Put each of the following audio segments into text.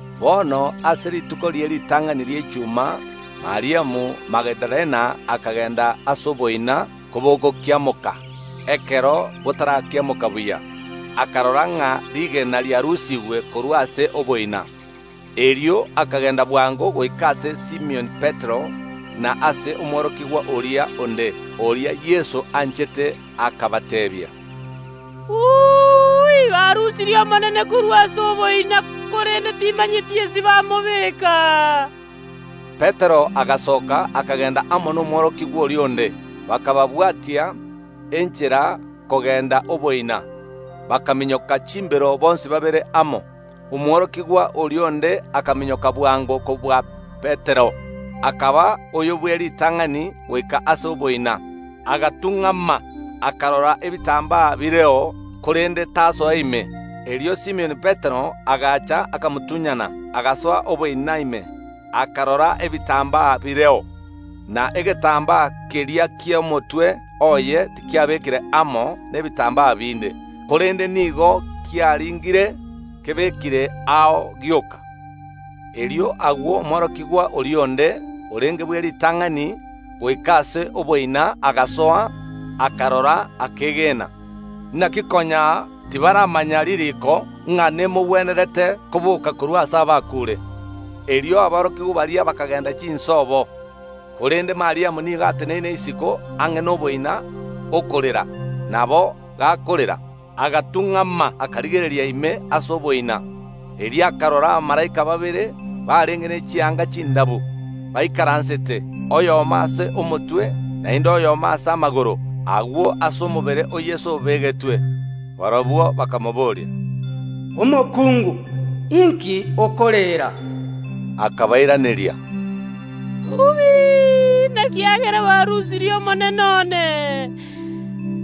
Bono ase rituko rie ritang’ani ri’echuma Mariamu; Magidalena akagenda ase oboina kobogokiamoka, ekero botarakiamoka buya, akarora ng’a rigena riarusigwe korwa ase oboina. Erio akagenda bwango goika ase Simioni Petero, na ase omworokigwa oria onde, oria Yeso anchete, akabateebia, “Barusirie Omonene korwa ase oboina, korende titomanyeti aase bamobeka.” Petero agasoka, akagenda amo nomworokigwa oria onde, bakabwatia enchera kogenda oboina. Bakaminyoka chimbero bonsi babere amo. Omworokigwa oria onde akaminyoka bwango kobua Petero, akaba oyo bw’eritang’ani goika ase oboina, agatung’ama, akarora ebitambaa bireo, korende tasoa ime. Erio Simioni Petero agacha, akamotunyana, agasoa oboina ime, akarora ebitambaa bireo, na egetambaa keria ki’omotwe oye tikiabekire amo nebitambaa binde, korende nigo kiaringire, kebekire ao gioka. Erio agwo omworokigwa oria onde orenge bw’eritang’ani goika ase oboina agasoa, akarora, akeegena. Naki konya tibaramanya ririiko, ng’a nemogwenerete koboka korwa ase abakuure. Erio aborokigwa baria bakagenda chinsobo. Korende Mariamu nigo ateneine isiko ang’e noboina, okorera; nabo gakorera, agatung’ama, akarigereria ime ase oboina. Erio akarora abamalaika babere, barenge ne chianga chindabu, baikaransete, oyomo ase omotwe, naende oyomo ase amagoro, agwo aase omobere o Yeso obegetwe. Barabwo bakamobooria, “Omokungu, inki okorera?” Akabairaneria, “Nekiagera barusirie Omonene one,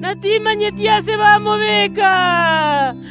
na timanyeti aase bamobeka.”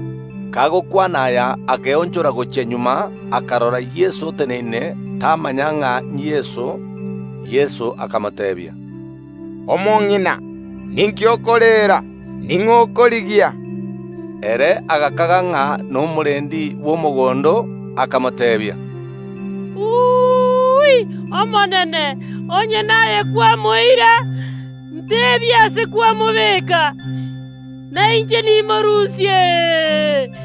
Kagokwana aya akeonchora gochia magega, akarora Yeso oteneine, tamanya ng’a n’Yeso. Yeso akamoteebia, “Omong’ina, ninki okorera? Ning’o okorigia?” Ere agakaga ng’a nomorendi bw’omogondo, akamoteebia, “Omonene, onye naye kwamoira, nteebia aase kwamobeka, na inche nimorusie.”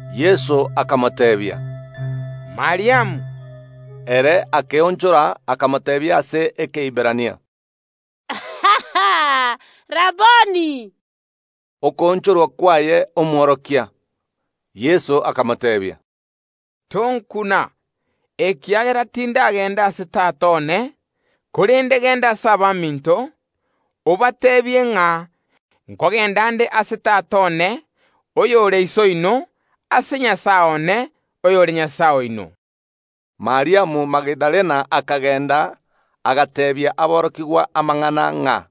Yeso akamoteebia, “Mariamu.” Ere akeonchora, akamoteebia ase Ekeiberania, “Raboni!” (Okoonchorwa kwaye, Omworokia). Yeso akamoteebia, “Tonkuna, ekiagera tindagenda ase Tata one, korende genda ase abaminto, obateebie, ng’a nkogenda nde ase Tata one oyore Iso oino, ase Nyasae one oyore Nyasae oino.” Mariamu Magidalena akagenda, agateebia aborokigwa amang’ana ng’a,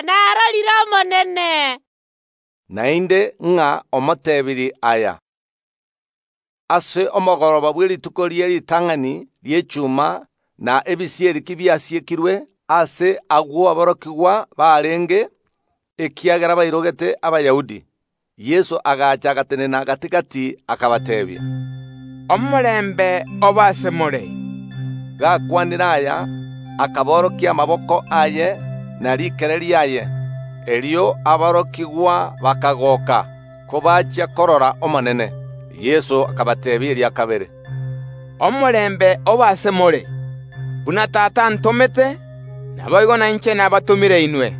“Narorire Omonene”, naende ng’a omotebirie aya. Ase omogoroba bwe rituko rie ritang’ani ri’echuma, na ebisieri kobiasiekirwe aase agwo aborokigwa barenge, ekiagera bairogete Abayahudi, Yeso agacha, agatenena gati‐gati akabateebia, “Omorembe obe ase more!” Gakwanire aya, akaborokia amaboko aye ne rikere riaye. Erio aborokigwa bakagoka kobachia korora Omonene. Yeso akabateebia eria kabere, “Omorembe obe ase more! Buna Tata antomete, naboigo nainche nabatomire inwe.”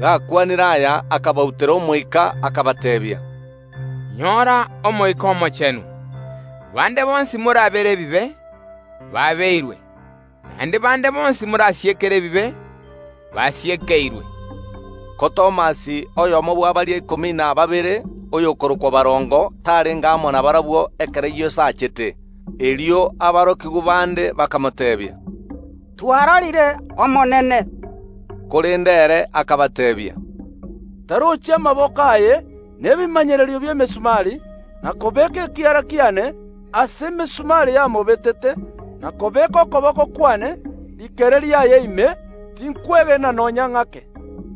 Gakwanire aya, akabautera omoika, akabateebia, “Nyora Omoika Omochenu. Bande bonsi morabere ebibe, baabeirwe; naende bande bonsi morasiekere ebibe, basiekeirwe.” Ko Thomas, oyomo bwa baria ikomi na babere, oyokorokwa Barongo, tarenge amo nabarabwo ekero Yeso achete. Erio aborokigwa bande bakamoteebia, “Twarorire Omonene.” Korende ere akabateebia, “Ntarochi amaboko aye na ebimanyererio bi’emesumari, na kobeeka ekiara kiane aase emesumari yamobetete, na kobeeka okoboko kwane rikere riaye ime, tinkwegena nonya ng’ake.”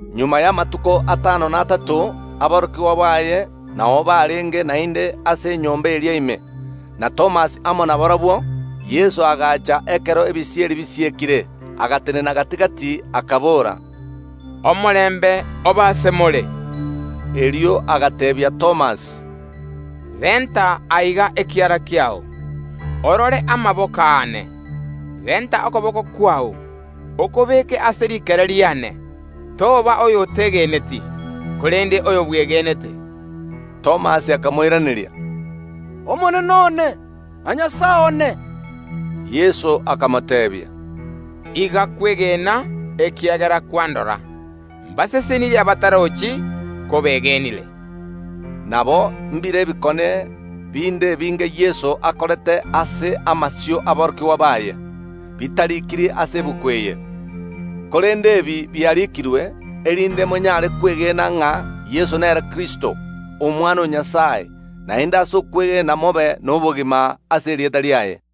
Magega y’amatuko atano na atato aborokigwa baye nao barenge naende ase enyomba eria ime, na Thomas amo nabarabwo. Yeso agacha ekero ebisieri bisiekire, agatenena gati‐gati, akabora, “Omorembe obe ase more!” Erio agateebia Thomas, “Renta aiga ekiara kiao. Orore amaboko aane. Renta okoboko kwao, okobeke ase rikere riane; toba oyotegeneti, korende oyo bwegenete.” Thomas akamoiraneria, “Omonene one, na Nyasae one!” Yeso akamoteebia, “Iga kwegena ekiagera kwandora; mbare nomogooko abatarochi ko begenire.” Nabo mbire ebikone binde ebinge Yeso akorete ase amasio y’aborokigwa baye bitarikiri ase egetabu eke, korende ebi biarikirwe, erinde monyare kwegena ng’a Yeso nere Kristo, Omwana o Nyasae; naende ase okwegena mobe nobogima ase erieta riaye.